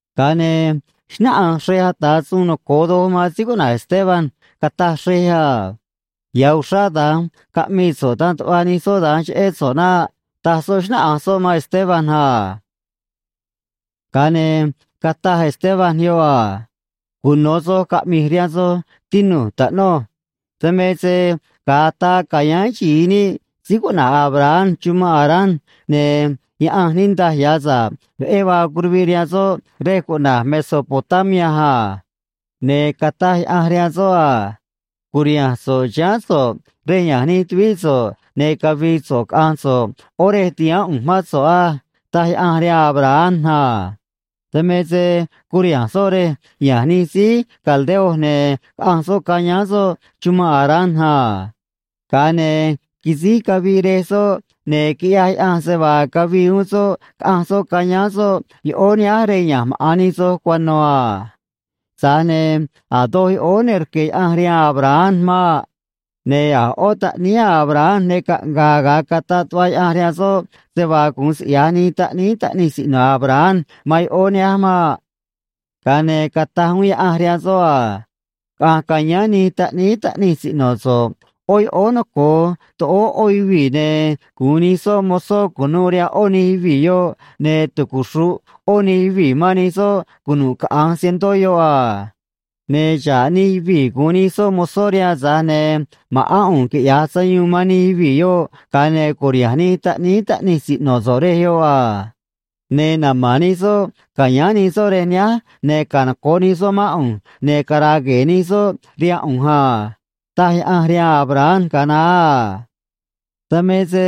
Ga̱a ne̱ xnáꞌanj xrej ata̱ suun noco̱o doj man síí cuꞌna̱j Esteban, cataj xrej a: ―Ya̱ uxrá da̱nj caꞌmii so̱ꞌ dan tuꞌva nij soꞌ da̱nj cheꞌé so̱ꞌ naꞌ ―taj soꞌ, xnáꞌanj soꞌ man Esteban a. Ga̱a ne̱ cataj Esteban yoꞌ a: ―Cuno̱ soj caꞌmi̱j rihaan soj, tinu̱j, taꞌnuj. Dan me se ga̱a ataa ca̱yáán xi̱i níꞌ síí cuꞌna̱j Abraham chumanꞌ Harán, ne̱ Yaꞌanj niꞌndaj ya̱ sa̱ꞌ veꞌé vaa curuviꞌ rihaan soꞌ rej cuꞌna̱j Mesopotamia a. Ne̱ cataj Yaꞌanj rihaan soꞌ a: “Cu̱riha̱nj so̱ꞌ chiháán so̱ꞌ rej ya̱nj nij tuvíꞌ so̱ꞌ, ne̱ cavi̱i̱ so̱ꞌ caꞌa̱nj so̱ꞌ ꞌo̱ rej ti̱haán ꞌu̱nj mán so̱ꞌ á”, taj Yaꞌanj rihaan Abraham a. Dan me se curiha̱nj soꞌ rej ya̱nj nij síí caldeo, ne̱ caꞌanj soꞌ cayáán soꞌ chumanꞌ Harán a. Ga̱a ne̱ quisíj caviꞌ rej soꞌ, ne̱ quiꞌyaj Yaꞌanj se vaa cavii uún soꞌ, caꞌanj soꞌ cayáán soꞌ yoꞌóó nihánj rej ya̱nj maꞌa̱n nij soj cuano̱ a. Tza̱j ne̱ a̱ doj yoꞌóó ne rque̱ Yaꞌanj rihaan Abraham maꞌ. Ne̱ a̱ ꞌó taꞌníí Abraham ne caꞌnga̱a̱ ga̱a cataꞌ tuꞌva Yaꞌanj rihaan soꞌ se vaa gu̱un siꞌya̱j nij taꞌníí taꞌnij siꞌno̱ Abraham man yoꞌóó nihánj maꞌ. ’Ga̱a ne̱ cataj uún Yaꞌanj rihaan soꞌ a: “Caꞌa̱nj ca̱yáán nij taꞌníí taꞌnij siꞌno̱ so̱ꞌ ꞌó yoꞌóó noco̱o toꞌóó ꞌó yuvii̱, ne̱ gu̱un nij soꞌ mozó cu̱nuû rihaan ꞌó nij yuvii̱ yoꞌ, ne̱ tucuxru̱ꞌ ꞌó nij yuvii̱ man nij soꞌ cunu̱ꞌ caꞌa̱nj cientó yoꞌ a. Ne̱ xa̱ꞌ nij yuvii̱ gu̱un nij soꞌ mozó rihaan, tza̱j ne̱ ma̱ꞌán ꞌu̱nj quiꞌya̱j sayuun man nij yuvii̱ yoꞌ, ga̱a ne̱ cu̱riha̱nj nij taꞌníí taꞌnij siꞌno̱ so̱ꞌ rej yoꞌ a. Ne̱ nama̱n nij soꞌ ca̱yáán nij soꞌ rej nihánj, ne̱ canoco̱ꞌ nij soꞌ mán ꞌu̱nj, ne̱ cara̱a̱ gue̱e̱ nij soꞌ rihaan ꞌu̱nj a”, taj Yaꞌanj rihaan Abraham ga̱a naá a. ’Dan me se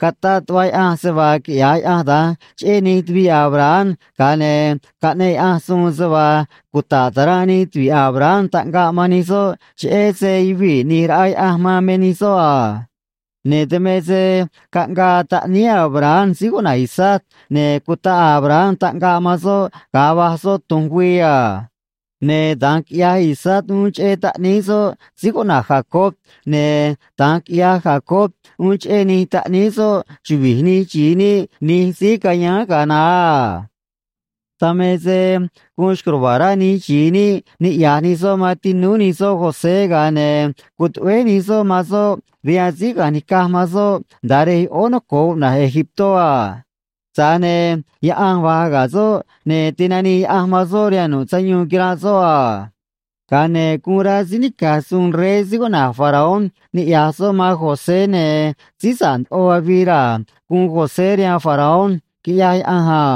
cataꞌ tuꞌva Yaꞌanj se vaa quiꞌya̱j Yaꞌanj da̱nj cheꞌé nij tuviꞌ Abraham, ga̱a ne̱ caꞌneꞌ Yaꞌanj suun se vaa cuta̱ꞌ ta̱ranꞌ nij tuvi̱ꞌ Abraham taꞌngaꞌ man nij soꞌ, cheꞌé se yuvii̱ ꞌni̱j raꞌa Yaꞌanj man me nij soꞌ a. Ne̱ dan me se caꞌngaa taꞌníí Abraham síí cuꞌna̱j Isaac, ne̱ cutaꞌ Abraham taꞌngaꞌ man soꞌ ga̱a va̱j soꞌ tu̱nj güii a. Ne̱ da̱nj quiꞌyaj Isaac uún cheꞌé taꞌníí soꞌ síí cuꞌna̱j Jacob, ne̱ da̱nj quiꞌyaj Jacob uún cheꞌé nij taꞌníí soꞌ chuvi̱j nij xi̱i níꞌ nij síí cayáán ga̱a naá a. ’Dan me se guun xco̱j ruva̱a̱ rá nij xi̱i níꞌ niꞌya̱j nij soꞌ man tinúú nij soꞌ José, ga̱a ne̱ cutuꞌvéj nij soꞌ man soꞌ rihaan síí caꞌanj nica̱j man soꞌ nda̱a rej yoꞌóó noco̱o cuꞌna̱j Egiptó a. Tza̱j ne̱ Yaꞌanj va̱j ga̱ soꞌ, ne̱ tinanii Yaꞌanj man soꞌ rihaan nu̱ꞌ sayuun quiranꞌ soꞌ a. Ga̱a ne̱ guun rá síí nica̱j suun rey síí cuꞌna̱j Faraón niꞌya̱j soꞌ man José, ne̱ síí sa̱ꞌ ndoꞌo avii raa̱ guun José rihaan Faraón, quiꞌyaj Yaꞌanj a.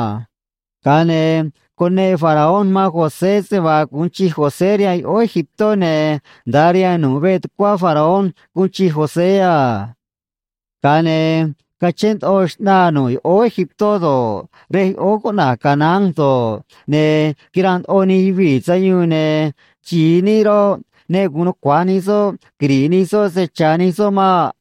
Ga̱a ne̱ cuneꞌ Faraón man José se vaa gu̱un chij José rihaan yoꞌóó Egiptó, ne̱ nda̱a rihaan nu̱ꞌ veꞌ tucuá Faraón guun chij José a. ’Ga̱a ne̱ cachén ndoꞌo xꞌnaa nu̱ꞌ yoꞌóó Egiptó do̱ꞌ, rej yoꞌóó cuꞌna̱j Canaán do̱ꞌ, ne̱ quiranꞌ ndoꞌo nij yuvii̱ sayuun, ne̱ xi̱i níꞌ roꞌ, ne gu̱un nucua̱j nij soꞌ quiri̱ꞌ nij soꞌ se cha̱ nij soꞌ maꞌ.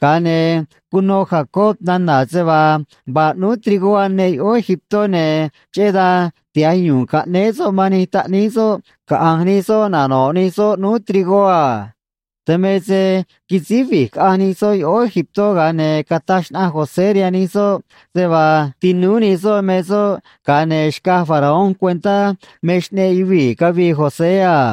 Ga̱a ne̱ cuno Jacob nana̱ se vaa vaa ꞌnúú trigó aneꞌ yoꞌóó Egiptó, ne̱ cheꞌé dan tiha̱j yu̱u̱n caꞌnéé soꞌ man nij taꞌníí soꞌ caꞌa̱nj nij soꞌ nano̱ꞌ nij soꞌ ꞌnúú trigó a. Dan me se quisíj vi̱j caꞌanj nij soꞌ yoꞌóó Egiptó, ga̱a ne̱ cataj xnaꞌanj José rihaan nij soꞌ se vaa tinúú nij soꞌ me soꞌ, ga̱a ne̱ xcaj Faraón cuentá me xꞌneꞌ yuvii̱ cavii José a.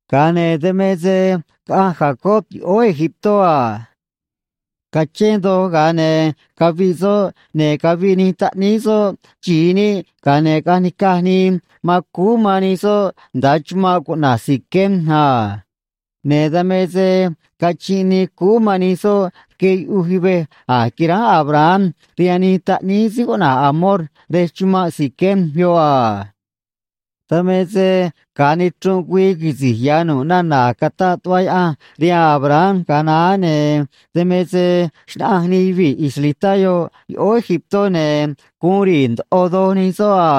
Ga̱a ne̱ dan me se caꞌanj Jacob yoꞌóó Egiptó a. Cachén doj, ga̱a ne̱ caviꞌ soꞌ, ne̱ caviꞌ nij taꞌníí soꞌ xi̱i níꞌ, ga̱a ne̱ caꞌanj nica̱j nii man cúú man nij soꞌ nda̱a chumanꞌ cuꞌna̱j Siquem a. Ne̱ dan me se cachinꞌ nii cúú man nij soꞌ rque yuꞌuj yuvej a̱j quiránj Abraham rihaan nij taꞌníí síí cuꞌna̱j Hamor rej chumanꞌ Siquem yoꞌ a. ’Dan me se ga̱a nichrunꞌ güii quisi̱j ya̱ nu̱ꞌ nana̱ a̱j cataꞌ tuꞌva Yaꞌanj rihaan Abraham ga̱a naá, ne̱ dan me se xnaꞌanj nij yuvii̱ israelitá yoꞌ yoꞌóó Egiptó, ne̱ guun ri̱i̱ ndoꞌo doj nij soꞌ a.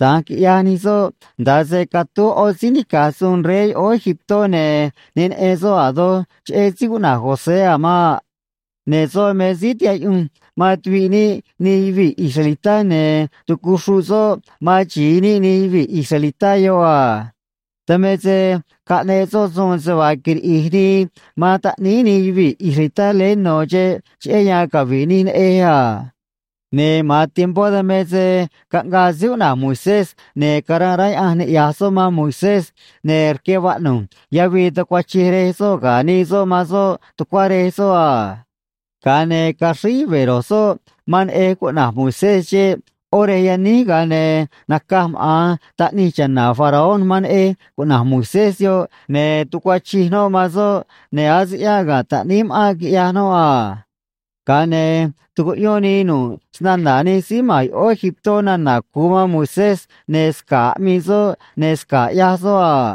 Da̱nj quiꞌyaj nij soꞌ nda̱a se catúj ꞌó síí nica̱j suun rey yoꞌóó Egiptó, ne̱ ne neꞌen soꞌ a̱ doj cheꞌé síí cuꞌna̱j José a̱ maꞌ. Ne̱ soꞌ me síí tihaꞌ yuꞌunj man tuviꞌ níꞌ nij yuvii̱ israelitá, ne̱ tucuxruꞌ soꞌ man xi̱i níꞌ nij yuvii̱ israelitá yoꞌ a. Dan me se caꞌneꞌ soꞌ suun se vaa quiriꞌi̱j nii man taꞌníí nij yuvii̱ israelitá leé no̱ xeꞌ, cheꞌé yan cavi̱ꞌ nij neꞌej a. Ne̱ ma̱an tiempó dan me se caꞌngaa síí cuꞌna̱j Moisés, ne̱ caranꞌ rá Yaꞌanj niꞌya̱j soꞌ man Moisés, ne̱ rque vaꞌnu̱j yavii tucuachij rej soꞌ ga̱ nii soꞌ man soꞌ tucuá rej soꞌ a. Ga̱a ne̱ caxríj yuve̱ ro̱j soꞌ man neꞌej cuꞌna̱j Moisés xeꞌ ꞌó rej yaníj, ga̱a ne̱ naca̱j maꞌa̱n taꞌnij cha̱na̱ Faraón man neꞌej cuꞌna̱j Moisés yoꞌ, ne̱ tucuachij noꞌ man soꞌ, ne̱ ase ꞌyáꞌ ga̱ taꞌníí ma̱ꞌánꞌ quiꞌyaj noꞌ a. Ga̱a ne̱ tucuꞌyón nii nu̱ꞌ snana̱ nij síí ma̱n yoꞌóó Egiptó nana̱ cu̱u man Moisés, ne̱ sca̱ꞌ aꞌmii soꞌ ne̱ sca̱ꞌ ꞌyaj soꞌ a.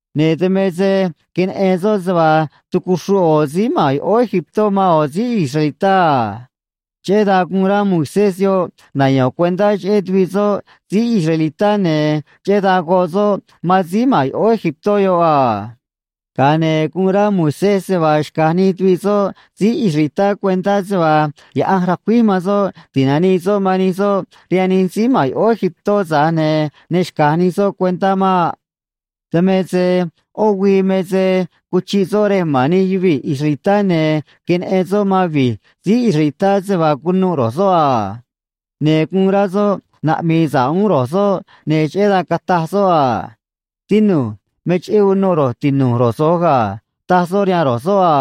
Ne̱ dan me se queneꞌen soꞌ se vaa tucuxruꞌ ꞌo̱ síí ma̱n yoꞌóó Egiptó man ꞌo̱ síí israelitá a. Cheꞌé dan guun rá Moisés yoꞌ nayo̱n cuentá cheꞌé tuviꞌ soꞌ síí israelitá, ne̱ cheꞌé dan goꞌ soꞌ man síí ma̱n yoꞌóó Egiptó yoꞌ a. Ga̱a ne̱ guun rá Moisés se vaa xca̱j nij tuviꞌ soꞌ síí israelitá cuentá se vaa Yaꞌanj ra̱cuíj man soꞌ ti̱nanii soꞌ man nij soꞌ rihaan nij síí ma̱n yoꞌóó Egiptó, tza̱j ne̱ ne xca̱j nij soꞌ cuentá maꞌ. ’Dan me se ꞌó güii me se cuchiꞌ soꞌ rej ma̱n nij yuvii̱ israelitá, ne̱ queneꞌen soꞌ man vi̱j síí israelitá se vaa cunuꞌ roj soꞌ a. Ne̱ guun rá soꞌ naꞌmi̱i̱ sa̱ꞌ uún ro̱j soꞌ, ne̱ cheꞌé dan cataj soꞌ a: “Tinu̱j. Me cheꞌé unuꞌ ro̱j tinu̱j ro̱j so̱j ga̱”, taj soꞌ rihaan ro̱j soꞌ a.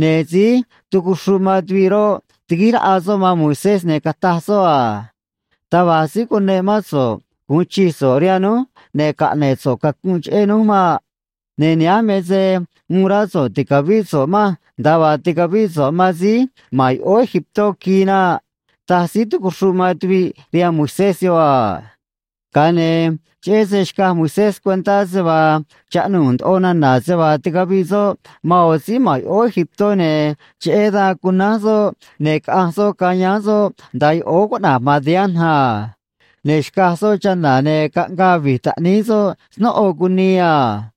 Ne̱ síí tucuxruꞌ man tuviꞌ roꞌ, tiguíj raꞌa soꞌ man Moisés, ne̱ cataj soꞌ a: “Taj va̱j síí cuneꞌ mán so̱ꞌ gu̱un chij so̱ꞌ rihaan núj ne̱ caꞌne̱ꞌ so̱ꞌ cacunꞌ cheꞌé núj maꞌ. Ne̱ nihánj me se uun rá so̱ꞌ ti̱cavíꞌ so̱ꞌ manj, nda̱a vaa ticavíꞌ so̱ꞌ man síí ma̱n yoꞌóó Egiptó quii naꞌ”, taj síí tucuxruꞌ man tuviꞌ rihaan Moisés yoꞌ a. Ga̱a ne̱ cheꞌé se xcaj Moisés cuentá se vaa chaꞌnuu̱ ndoꞌo nana̱ se vaa ticaviꞌ soꞌ man ꞌo̱ síí ma̱n yoꞌóó Egiptó, ne̱ cheꞌé dan cunánj soꞌ, ne̱ caꞌanj soꞌ cayáán soꞌ nda̱a yoꞌóó cuꞌna̱j Madián a. Ne̱ xcaj soꞌ chana̱, ne̱ caꞌngaa vi̱j taꞌníí soꞌ snóꞌo cunii a.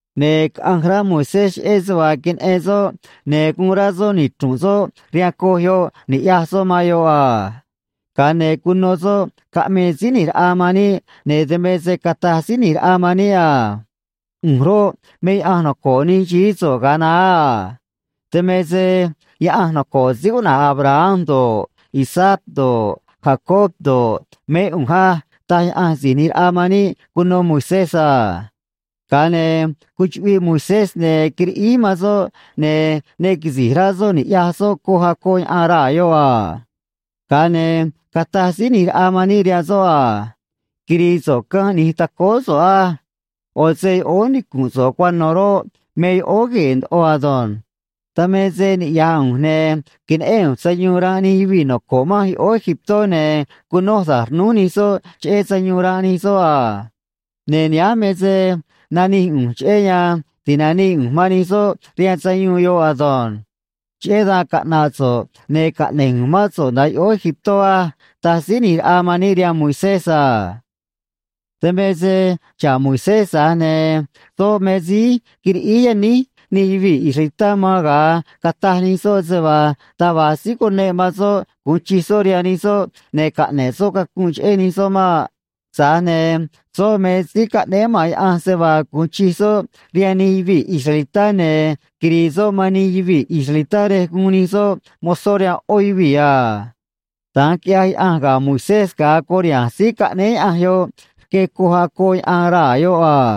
Ne̱ caꞌanj rá Moisés cheꞌé se vaa queneꞌen soꞌ, ne̱ guun rá soꞌ nichru̱nꞌ soꞌ rihaan coj yoꞌ ni̱ꞌyaj soꞌ man yoꞌ a. Ga̱a ne̱ cuno soꞌ caꞌmii Síí ꞌNi̱j Raꞌa man níꞌ, ne̱ dan me se cataj Síí ꞌNi̱j Raꞌa man níꞌ a: “ꞌU̱nj roꞌ, me Yaꞌanj noco̱ꞌ nij xií so̱ꞌ ga̱a naá a. Dan me se Yaꞌanj noco̱ꞌ síí cuꞌna̱j Abraham do̱ꞌ, Isaac do̱ꞌ, Jacob do̱ꞌ, mé ꞌu̱nj á”, taj Yaꞌanj Si̱j ꞌNi̱j Raꞌa man níꞌ cuno Moisés a. Ga̱a ne̱ cuchuꞌviꞌ Moisés ne̱ quiriꞌíj man soꞌ, ne̱ ne quisi̱j rá soꞌ ni̱ꞌyaj soꞌ coj acoꞌ yaꞌan raa̱ yoꞌ a. Ga̱a ne̱ cataj Síí ꞌNi̱j Raꞌa man níꞌ rihaan soꞌ a: “Quiri̱i̱ so̱ꞌ canj ꞌni̱j tacóó so̱ꞌ á. ꞌO̱ se yoꞌóó nicu̱nꞌ so̱ꞌ cuano̱ roꞌ, me yoꞌóó gue̱e̱ ndoꞌo ado̱nj. Dan me se niꞌya̱j ꞌu̱nj, ne̱ queneꞌén ꞌu̱nj sayuun ranꞌ nij yuvii̱ noco̱ꞌ manj yoꞌóó Egiptó, ne̱ cunoj da̱j rnúj nij soꞌ cheꞌé sayuun ranꞌ nij soꞌ a. Ne̱ nihánj me se nanij ꞌu̱nj cheꞌé yan ti̱nanii ꞌu̱nj man nij soꞌ rihaan sayuun yoꞌ ado̱nj. Cheꞌé dan caꞌna̱ꞌ so̱ꞌ, ne̱ caꞌne̱j ꞌu̱nj mán so̱ꞌ nda̱a yoꞌóó Egiptó á”, taj Síí ꞌNi̱j Raꞌa man níꞌ rihaan Moisés a. ’Dan me se xa̱ꞌ Moisés, tza̱j ne̱ soꞌ me síí quiriꞌíj yaníj nij yuvii̱ israelitá man ga̱a cataj nij soꞌ se vaa taj va̱j síí cuneꞌ man soꞌ gu̱un chij soꞌ rihaan nij soꞌ ne̱ caꞌne̱ꞌ soꞌ cacunꞌ cheꞌé nij soꞌ maꞌ. Tza̱j ne̱ soꞌ me síí caꞌnéé maꞌa̱n Yaꞌanj se vaa gu̱un chij soꞌ rihaan nij yuvii̱ israelitá ne̱ quiri̱i̱ soꞌ man nij yuvii̱ israelitá rej guun nij soꞌ mozó rihaan ꞌó yuvii̱ a. Da̱nj quiꞌyaj Yaꞌanj ga̱ Moisés ga̱a curiha̱nj síí caꞌnéé Yaꞌanj yoꞌ rque coj acoꞌ yaꞌan raa̱ yoꞌ a.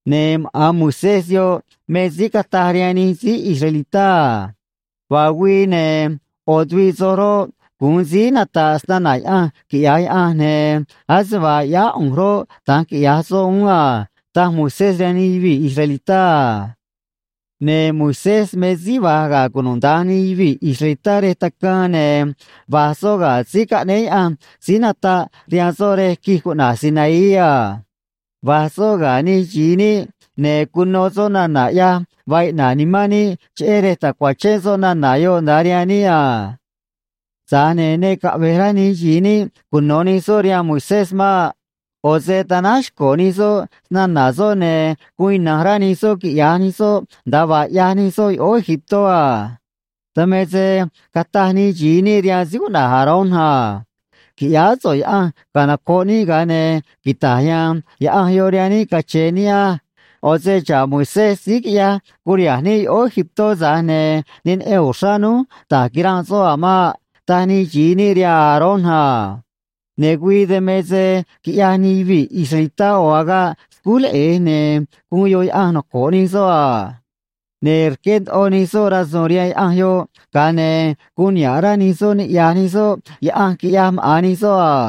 Ne̱ maꞌa̱n Moisés yoꞌ me síí cataj rihaan nij síí israelitá a: “Vaa güii, ne̱ ꞌo̱ tuviꞌ soj roꞌ, gu̱un síí nata̱ꞌ snana̱ Yaꞌanj, quiꞌya̱j Yaꞌanj, ne̱ ase vaa ꞌyáá ꞌu̱nj roꞌ, da̱nj quiꞌya̱j soꞌ uún a”, taj Moisés rihaan nij yuvii̱ israelitá a. ’Ne̱ Moisés me síí va̱j ga̱ cunuda̱nj nij yuvii̱ israelitá rej tacaan, ne̱ va̱j soꞌ ga̱ síí caꞌnéé Yaꞌanj síí nataꞌ rihaan soꞌ rej quij cuꞌna̱j Sinaí a. Va̱j soꞌ ga̱ nij xi̱i níꞌ, ne̱ cuno soꞌ nana̱ ꞌyaj vaa iꞌna̱ꞌ nimán níꞌ, cheꞌé rej ta̱cuachén soꞌ nana̱ yoꞌ nda̱a rihaan níꞌ a. ’Tza̱j ne̱ ne caꞌve̱j rá nij xi̱i níꞌ cuno̱ nij soꞌ rihaan Moisés maꞌ. ꞌO̱ se tanáj xco̱ nij soꞌ snana̱ soꞌ, ne̱ guun ina̱nj rá nij soꞌ quiꞌya̱j nij soꞌ nda̱a vaa ꞌyaj nij soꞌ yoꞌóó Egiptó a. Dan me se cataj nij xi̱i níꞌ rihaan síí cuꞌna̱j Aarón a: “Qui̱ꞌyáá so̱ꞌ yaꞌanj canoco̱ꞌ níꞌ, ga̱a ne̱ quita̱j ya̱a̱n yaꞌanj yoꞌ rihaan níꞌ cache̱e̱ níꞌ á. ꞌO̱ se xa̱ꞌ Moisés síí quiꞌyaj curiha̱nj níꞌ yoꞌóó Egiptó, tza̱j ne̱ ne neꞌen uxrá núj da̱j quiranꞌ soꞌ a̱ maꞌ”, taj nij xi̱i níꞌ rihaan Aarón a. Ne̱ güii dan me se quiꞌyaj nij yuvii̱ israelitá ꞌo̱ agaꞌ scúj leꞌe̱j, ne̱ guun yoꞌ yaꞌanj noco̱ꞌ nij soꞌ a. Ne̱ rqué ndoꞌo nij soꞌ rasu̱u̱n rihaan yaꞌanj yoꞌ, ga̱a ne̱ guun niha̱ꞌ rá nij soꞌ niꞌya̱j nij soꞌ yaꞌanj quiꞌyaj maꞌa̱n nij soꞌ a.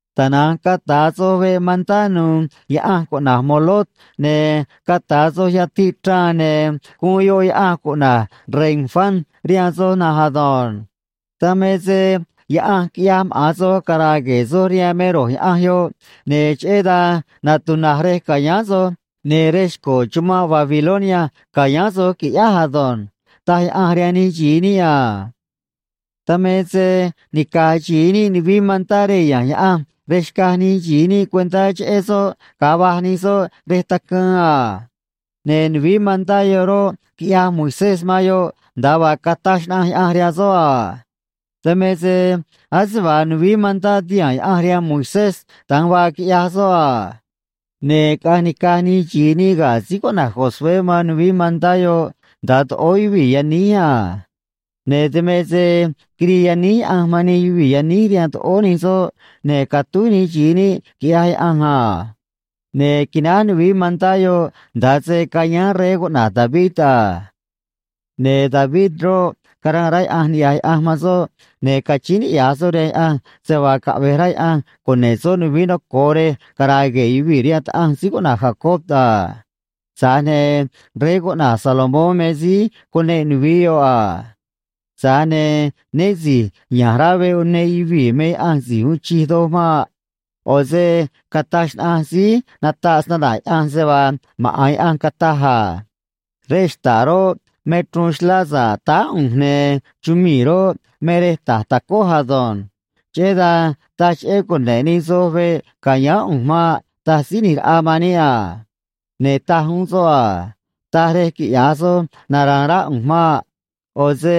Tana̱nj cata̱ soj veꞌ mantá nu̱u̱ yaꞌanj cuꞌna̱j Moloc, ne̱ cata̱ soj yatiꞌ chraan, ne̱ guun yoꞌ yaꞌanj cuꞌna̱j Renfán rihaan soj na̱nj ado̱nj. Dan me se yaꞌanj quiꞌyaj maꞌa̱n soj cara̱a̱ gue̱e̱ soj rihaan me ro̱j yaꞌanj yoꞌ, ne̱ cheꞌé dan natuna̱j rej ca̱yáán soj, ne̱ rej xco̱ chumanꞌ Babilonia ca̱yáán soj, qui̱ꞌyáj ado̱nj, taj Yaꞌanj rihaan nij xi̱i níꞌ a. ’Dan me se nica̱j xi̱i níꞌ nuvií mantá rej ya̱nj Yaꞌanj rej xcaj nij xi̱i níꞌ cuentá cheꞌé soꞌ ga̱a va̱j nij soꞌ rej tacaan a. Ne̱ nuvií mantá yoꞌ roꞌ, quiꞌyaj Moisés man yoꞌ nda̱a vaa cataj xnaꞌanj Yaꞌanj rihaan soꞌ a. Dan me se ase vaa nuvií mantá tihaa̱n Yaꞌanj rihaan Moisés, da̱nj vaa quiꞌyaj soꞌ a. Ne̱ caꞌanj nica̱j nij xi̱i níꞌ ga̱ síí cuꞌna̱j Josué man nuvií mantá yoꞌ nda̱a toꞌóó yuvii̱ yaníj a. Ne̱ dan me se quirii yaníj Yaꞌanj man nij yuvii̱ yaníj rihaan toꞌóó nij soꞌ, ne̱ catúj nij xi̱i níꞌ, quiꞌyaj Yaꞌanj a. Ne̱ quináj nuvií mantá yoꞌ nda̱a se cayáán rey cuꞌna̱j David a. ’Ne̱ David roꞌ, caranꞌ rá Yaꞌanj niꞌya̱j Yaꞌanj man soꞌ, ne̱ cachíín niꞌya̱j soꞌ rihaan Yaꞌanj se vaa caꞌve̱j rá Yaꞌanj cune̱ꞌ soꞌ nuvií noco̱o rej cara̱a̱ gue̱e̱ yuvii̱ rihaan Taꞌanj síí cuꞌna̱j Jacob a. Tza̱j ne̱ rey cuꞌna̱j Salomón me síí cuneꞌ nuvií yoꞌ a. Tza̱j ne̱ né si̱j ya̱nj rá veꞌ uneꞌ yuvii̱ me Yaꞌanj Si̱j Uun Chij Doj maꞌ. ꞌO̱ se cataj xnaꞌanj síí nataꞌ snana̱ Yaꞌanj se vaa maꞌa̱n Yaꞌanj cataj a: Rej xta̱ꞌ roꞌ, me chruun xlá sa̱ꞌ táá ꞌu̱nj, ne̱ chumii̱ roꞌ, me rej ta̱j tacój ado̱nj. Cheꞌé dan taj cheꞌé cune̱ꞌ nij soj veꞌ ca̱yáán ꞌu̱nj maꞌ, taj Síí ꞌNi̱j Raꞌa man níꞌ a. Ne̱ taj uún soꞌ a: Taj rej quiꞌya̱j soj nara̱a̱n rá ꞌu̱nj maꞌ. ꞌO̱ se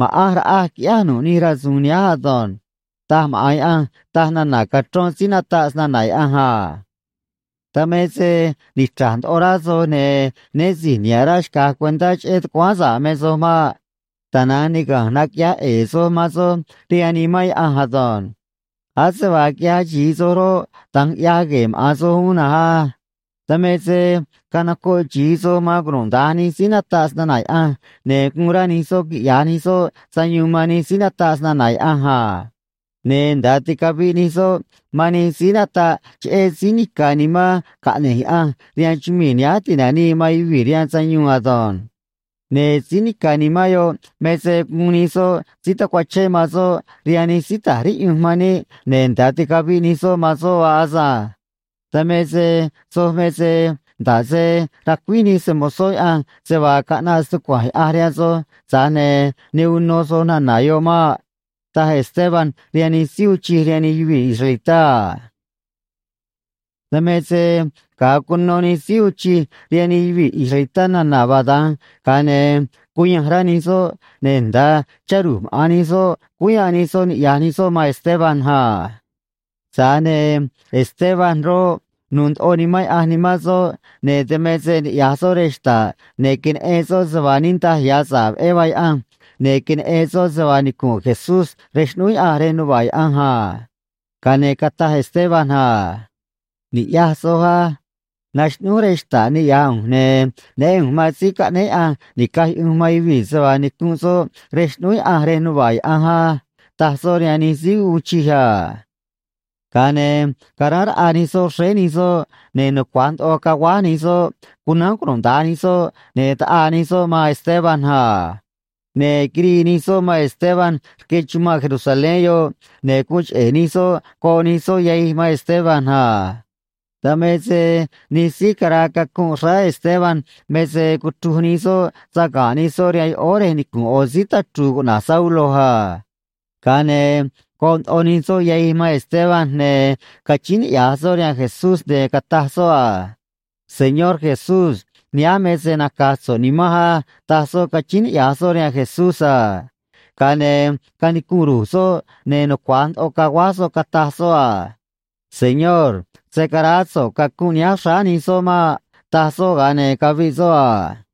ma̱ꞌanj raꞌaj quiꞌyáj nu̱ꞌ nij rasu̱u̱n nihánj ado̱nj, taj maꞌa̱n Yaꞌanj, taj nana̱ cachrón síí nataꞌ snana̱ Yaꞌanj a. ’Dan me se nichra̱j ndoꞌo rá soj, ne̱ né si̱j niha̱ꞌ rá xca̱j cuentá cheꞌé tucuáán sa̱ꞌ me soj maꞌ. Tana̱nj niga̱nj naquiꞌyaj ꞌe̱e̱ soj man soj rihaan Nimán Yaꞌanj ado̱nj. Ase vaa quiꞌyaj xi̱i soj roꞌ, da̱nj ꞌyaj gue̱e̱ maꞌa̱n soj uún na̱nj á. Dan me se canocoꞌ xi̱i soj man cunuda̱nj nij síí nataꞌ snana̱ Yaꞌanj, ne̱ guun rá nij soꞌ quiꞌya̱j nij soꞌ sayuun man nij síí nataꞌ snana̱ Yaꞌanj a. Ne̱ nda̱a ticaviꞌ nij soꞌ man nij síí nataꞌ cheꞌé Síí Nica̱ Nimán caꞌne̱j Yaꞌanj rihaan chumii̱ nihánj ti̱nanii man yuvii̱ rihaan sayuun ado̱nj. Ne̱ Síí Nica̱ Nimán yoꞌ me se guun nij soj síí tacuachén man soꞌ rihaan nij síí ta̱j riꞌyunj man níꞌ, ne̱ nda̱a ticaviꞌ nij soj man soꞌ vaa asânj. Dan me se soj me se nda̱ꞌ se racuíj nij se‑mo̱zó Yaꞌanj se vaa caꞌnaꞌ stucua̱nj Yaꞌanj rihaan soj, tza̱j ne̱ ne uno soj nana̱ yoꞌ maꞌ ―taj Esteban rihaan nij síí uun chij rihaan nij yuvii̱ israelitá a. Dan me se ga̱a cuno nij síí uun chij rihaan nij yuvii̱ israelitá nana̱ vaa da̱nj, ga̱a ne̱ cuyanj rá nij soꞌ, ne̱ nda̱a chá ru̱j maꞌa̱n nij soꞌ cúú yanꞌ nij soꞌ niꞌya̱j nij soꞌ man Esteban a. Tza̱j ne̱ Esteban roꞌ, nu̱u̱ ndoꞌo Nimán Yaꞌanj nimán soꞌ, ne̱ dan me se niꞌya̱j soꞌ rej xta̱ꞌ, ne̱ queneꞌen soꞌ se vaa niꞌndaj ya̱ sa̱ꞌ veꞌé vaa Yaꞌanj, ne̱ queneꞌen soꞌ se vaa nicu̱nꞌ Jesús rej xꞌnúú Yaꞌanj rej nuva̱ꞌ Yaꞌanj a. Ga̱a ne̱ cataj Esteban a: ―Ni̱ꞌyaj soj á. Naxꞌnúj rej xta̱ꞌ niꞌya̱j ꞌu̱nj, ne̱ neꞌén ꞌu̱nj man Síí Caꞌnéé Yaꞌanj Ni̱caj Yuꞌunj man Yuvii̱ se vaa nicunꞌ soꞌ rej xꞌnúú Yaꞌanj rej nuva̱ꞌ Yaꞌanj á ―taj soꞌ rihaan nij síí uun chij a. Ga̱a ne̱ caráán raꞌa nij soꞌ xréé nij soꞌ, ne̱ nucua̱j ndoꞌo caguáj nij soꞌ cunánj cunuda̱nj nij soꞌ, ne̱ taꞌaa nij soꞌ man Esteban a. Ne̱ quirii nij soꞌ man Esteban rque chumanꞌ Jerusalén yoꞌ, ne̱ guun cheꞌe̱ nij soꞌ goꞌ nij soꞌ yahij man Esteban a. Dan me se nij síí caraa cacunꞌ xráá Esteban me se cuchruj nij soꞌ saga̱nꞌ nij soꞌ rihaan yoꞌóó rej nicu̱nꞌ ꞌo̱ síí tachru̱u̱ cuꞌna̱j Saulo a. Ga̱a ne̱ goꞌ ndoꞌo nij soꞌ yahij man Esteban, ne̱ cachíín niꞌya̱j soꞌ rihaan Jesús, ne̱ cataj soꞌ a: ―Señor Jesús, nihánj me se naca̱j so̱ꞌ nimanj á ―taj soꞌ, cachíín niꞌya̱j soꞌ rihaan Jesús a. Ga̱a ne̱ canicunꞌ ru̱j soꞌ, ne̱ nucua̱j ndoꞌo caguáj soꞌ, cataj soꞌ a: ―Señor, se̱ caraá so̱ꞌ cacunꞌ nihánj xráá nij soꞌ maꞌ ―taj soꞌ, ga̱a ne̱ caviꞌ soꞌ a.